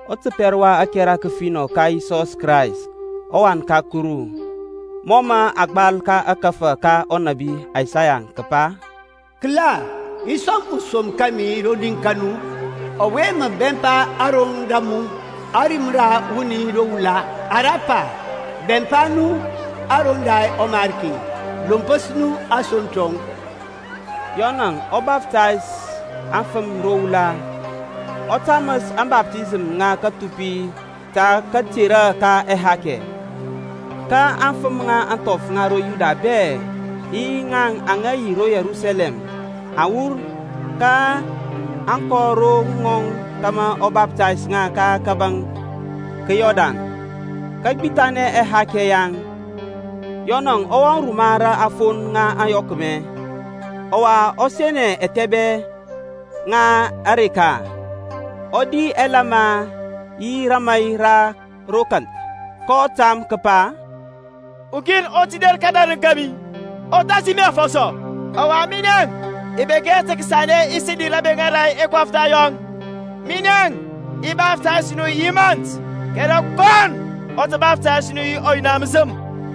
Ɔtəpɛr wa ȧkɛra kəfinɔ ka Yisɔs Krayst, ɔWan ka Kuru. Mɔ mə a gbal ka ȧkȧfȧ ka ɔnȧbi Isaya kəpa, Kəla, i som ɔsom kȧmi rodi ka mu, Ɔwe mə bɛmpa aroŋ da mu. Ȧrim ra wuni ro wula ara pa, Bɛmpa nu aroŋ da ɔMarki, Lompəs nu asoŋ tɔŋ. Yɔnȧŋ ɔwe baftays aŋfəm ro wula, ɔ taməs ȧŋbaftisəm ŋa kathupi ta katerɔ ka ɛhakɛ. Ka aŋfəm ŋa ȧŋthɔf ŋa ro Yuda bɛ, yi ŋaŋ aŋa ro Yerusalɛm, aŋ wur, kaŋ kɔ ro ŋɔŋ kȧmȧ ɔ baftays ŋa ka kȧbȧŋ ka Yɔrdan, kəgbithanɛ ɛhakɛ yaŋ. Yɔnȧŋ ɔ wɔŋ ruma ra aŋfon ŋa ȧyɔkmɛ, ɔwa ɔ senɛ ȧthɛbɛŋ ŋa areka. Ɔ di ɛlama yi rəmai ra ro kanth. kɔ tam kəpa, Ukin ɔ tə der kədarəŋ kȧmi, ɔ thasi mi afɔsɔ, ɔwa minɛ i bek hɛ sanɛ tə kəsəli rabeŋa ra ɛkɔftha yɔŋ. Minɛŋ i baftays nu yi mȧnt, kɛrɛ kɔnɔ ɔ tə baftays nu yi ɔYina məsəm.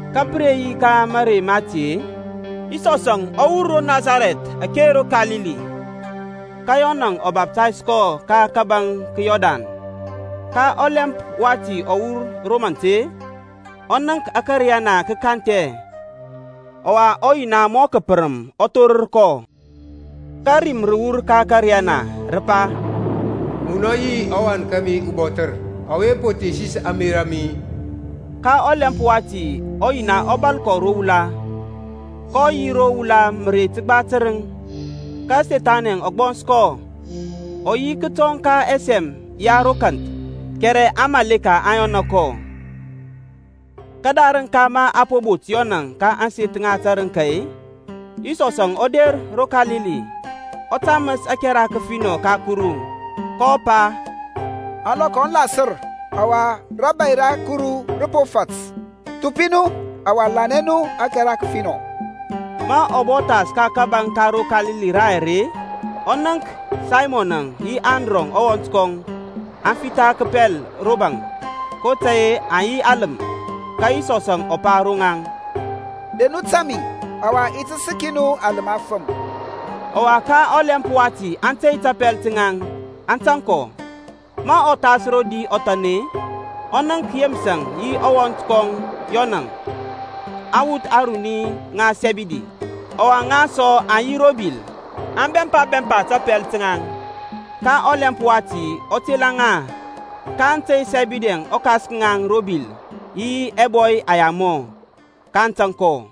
Ka pə re yi ka mȧrey mati-e, Yisɔsȧŋ ɔ wur ro Nasarɛth ake ro Kalili, ka Yɔnȧŋ ɔ baftays kɔ ka kȧbȧŋ ka Yɔrdan. Ka ɔlɛmp wati ɔ wur ro mant-e, ɔ nənk ȧkȧriyana kə kanthɛ, ɔwa ɔYina mɔ kəpərəm ɔ thorər kɔ. Ka rim rə wur ka ȧkȧriyana, rə pa, Munɔ yi ɔWan kȧmi ubɔthər, ɔwe po thesis ȧŋmerȧ a mi. Ka ɔlɛmp wati ɔYina ɔ bȧl kɔ ro wula. kɔ yi ro wula mərey təgba tərəŋ, ka Sethani ɔ gbɔns kɔ. Ɔ yi kətɔŋ ka ɛsɛm ya ro kanth, kɛrɛ aŋmȧleka aŋ yɔna kɔ. Kədarəŋ ka mə a po bot Yɔnȧŋ ka ȧŋseth ŋa tərəŋka-e, Yisɔsȧŋ ɔ der ro Kalili, ɔ taməs ȧkɛra kəfinɔ ka Kuru, kɔ pa, Ȧŋlɔkɔ aŋ lasər, ɔwa rȧbȧy ra Kuru rə po fat. Thupi nu, ɔwa lanɛ nu ȧkɛra kəfinɔ. Ma ɔ bɔ thas ka kȧbȧŋ ka ro Kalili rayɛr-e, ɔ nənk Saymɔnȧŋ yi Andrɔŋ ɔwɔnt kɔŋ, aŋ fitha kəpɛl ro baŋ, kotȧy-e aŋ yi aləm. Ka Yisɔsȧŋ ɔ pa ro ŋaŋ, Der nu tȧŋ mi, ɔwa i ti səki nu aləm afəm. Ɔwa ka ɔlɛmp wati aŋ tey tapɛl taŋ, aŋ tȧŋ kɔ. Ma ɔ thas rodi ɔthan-e, ɔ nənk Yeməsȧŋ yi ɔwɔnt kɔŋ Yɔnȧŋ, aŋwuth ŋa Sɛbidi, ɔwa ŋaŋ sɔ aŋ yi ro bil, aŋ bɛmpa bɛmpa tapɛl taŋ. Ka ɔlɛmp wati ɔ tela ŋa, kaŋ tey Sɛbidi-əŋ ɔkas ka ŋaŋ ro bil yi ɛbɔy ɛyamɔ, kaŋ tȧŋ kɔ.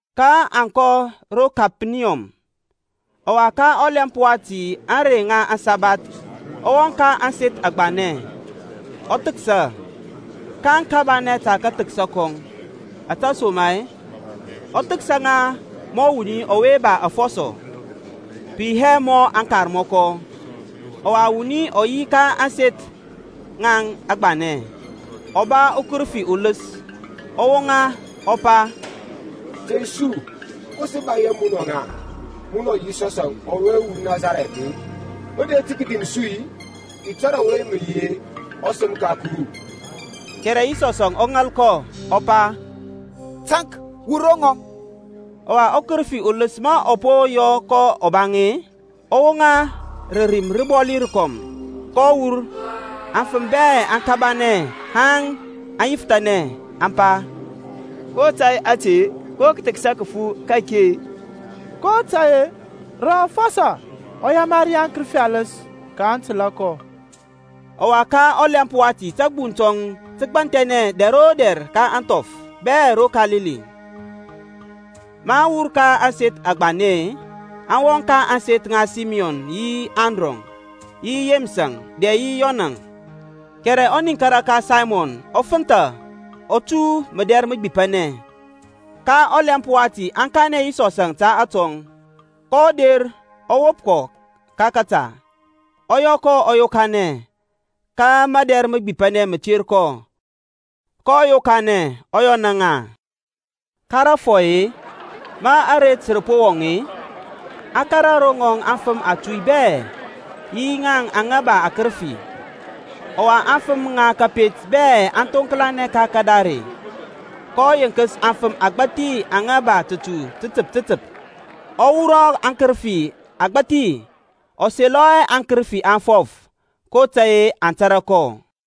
kaŋ kɔ ro Kepaniyɔm. Ɔwa ka ɔlɛmp wati ka ȧŋrey ŋa aŋsabath ɔ wɔŋ ka ȧŋseth agbanɛ, ɔ thəksa. kaŋ kabanɛ ta kathəksa kɔŋ, ȧtesoma-e ɔ thəksa ŋa mɔ wuni ɔwe ba afɔsɔ, pə yi hɛ mɔ aŋkarmɔkɔ. Ɔwa wuni ɔ yi ka ȧŋseth ŋaŋ agbanɛ, ɔ ba ukərəfi uləs. Ɔ woŋa, ɔ pa, Tey su, ko sə ba yi munɔŋ-a, munɔ Yisɔs ɔwe ro Nasarɛth-e? Mə der tə kədim su-i? I tȧrȧ ɔwe mə yi-e, ɔSəm ka Kuru. Kɛrɛ Yisɔs ɔ ŋal kɔ, ɔ pa, Taŋk, wur ro ŋɔŋ. Ɔwa ɔkərəfi uləs ma ɔ po yɔ kɔ ɔbaŋ-e, ɔ woŋa rə rim rəbɔli rəkɔm, kɔ wur. Aŋfəm bɛ aŋ kabanɛ haŋ aŋ yifthanɛ, aŋ pa, Ko tȧy te-e? Ko kəthəksa kəfu ka-ake-e? kotȧy-e rə afɔsɔ ɔ yamari aŋkərəfi aləs, kaŋ təlȧ kɔ. Ɔwa ka ɔlɛmp wati tȧgbuŋ tɔŋ tə gbanthɛnɛ dɛr o dɛr ka ȧŋthɔf bɛ ro Kalili. Maŋ wur ka ȧŋseth agbanɛ-e, aŋ wɔŋ ka ȧŋseth ŋa Saymɔn yi Andrɔŋ, yi Yeməsȧŋ dɛ yi Yɔnȧŋ. Kɛrɛ ɔniŋkara ka Saymɔn ɔ fənthȧ ɔ tu mədɛr məgbipanɛ. Ka ɔlɛmp wati aŋ kanɛ Yisɔsȧŋ ta atɔŋ. kɔ der ɔ wop kɔ ka kȧta, ɔ yɔ kɔ ɔ yokanɛ. Ka mədɛr məgbipanɛ mə ter kɔ, kɔ yokanɛ, ɔ yɔna ŋa. Ka rȧfɔy-e, ma aret rə po wɔŋ-e, aŋ kȧrȧ ro ŋɔŋ afəm atuy bɛ-e, yi aŋa ba akərəfi. Ɔwa aŋfəm ŋa kȧpet bɛ aŋ thoŋklanɛ ka kadare. kɔ yenkəs afəm agbȧthi aŋa ba tətu tətəp tətəp, ɔ wurɔ akərəfi agbȧthi. Ɔ selɔ hɛ aŋkərəfi aŋ fɔf, kotȧy-e aŋ tȧrȧ kɔ.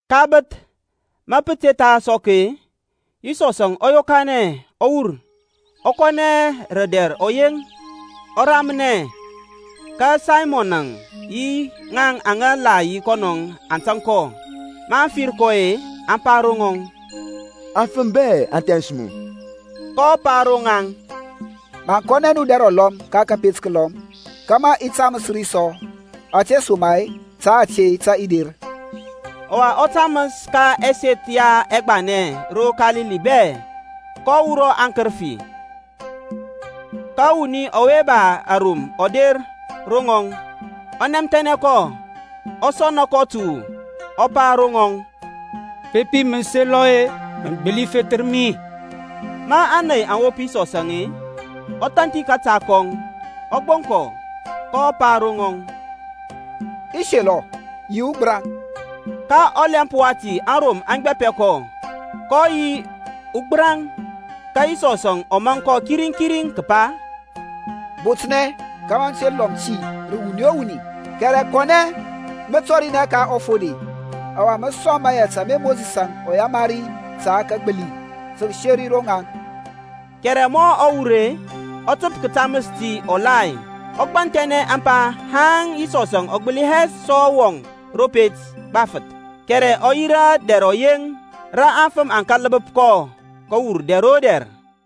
Ka bəth, ma pə te tha sɔk-e, Yisɔsȧŋ ɔ yokanɛ ɔ wur, ɔ kɔnɛ rə dɛr ɔyeŋ, ɔ ramnɛ. Ka Saymɔnȧŋ yi ŋaŋ aŋa la yi kɔnɔŋ aŋ tȧŋ kɔ. Maŋ fir kɔ-e, aŋ pa ro ŋɔŋ, Aŋfəm bɛ aŋ thɛns mu. kɔ pa ro ŋaŋ, Maŋ kɔnɛ nu dɛr ulɔm ka tapet təlɔm, kȧmȧ i taməs ri sɔ, ȧtesoma-e ta ȧte tə i der. Ɔwa ɔ taməs ka ɛseth yaŋ ɛgbanɛ ro Kalili bɛ, kɔ wurɔ akərəfi. Ka wuni ɔwe ba arom ɔ der ro ŋɔŋ, ɔ nɛmthɛnɛ kɔ, ɔ sɔna kɔ təwu, ɔ pa ro ŋɔŋ, Bepi mə selɔ-e, mə gbəli fethər mi. Ma ȧney aŋ wop Yisɔsȧŋ-e, ɔ thanthi kȧta kɔŋ, ɔ gboŋ kɔ, kɔ pa ro rɔŋɔŋ, I selɔ. Yi ugbəraŋ. Ka ɔlɛmp wati arom aŋ gbapɛ kɔ, kɔ yi ugbəraŋ. Ka Yisɔsȧŋ ɔ maŋ kɔ kiriŋ kiriŋ kəpa, Botnɛ kȧmȧ mə te lɔm ti rə wuni o wuni, kɛrɛ kɔnɛ mə tɔrinɛ ka ɔfode, ɔwa mə sɔŋ mayɛt ama Mosisȧŋ ɔ yamari ta kagbili, tə kəseri ro ŋaŋ. Kɛrɛ ma ɔ wur-e, ɔ təp kətaməs ti ɔgbathi, ɔ gbanthɛnɛ ȧŋpa haŋ Yisɔsȧŋ ɔ gbəli hɛ sɔ wɔŋ ro pet gbafəth, kɛrɛ ɔ yi gbo dɛr ɔyeŋ. Rə aŋfəm aŋ kȧl bəp kɔ kəwur dɛr o dɛr.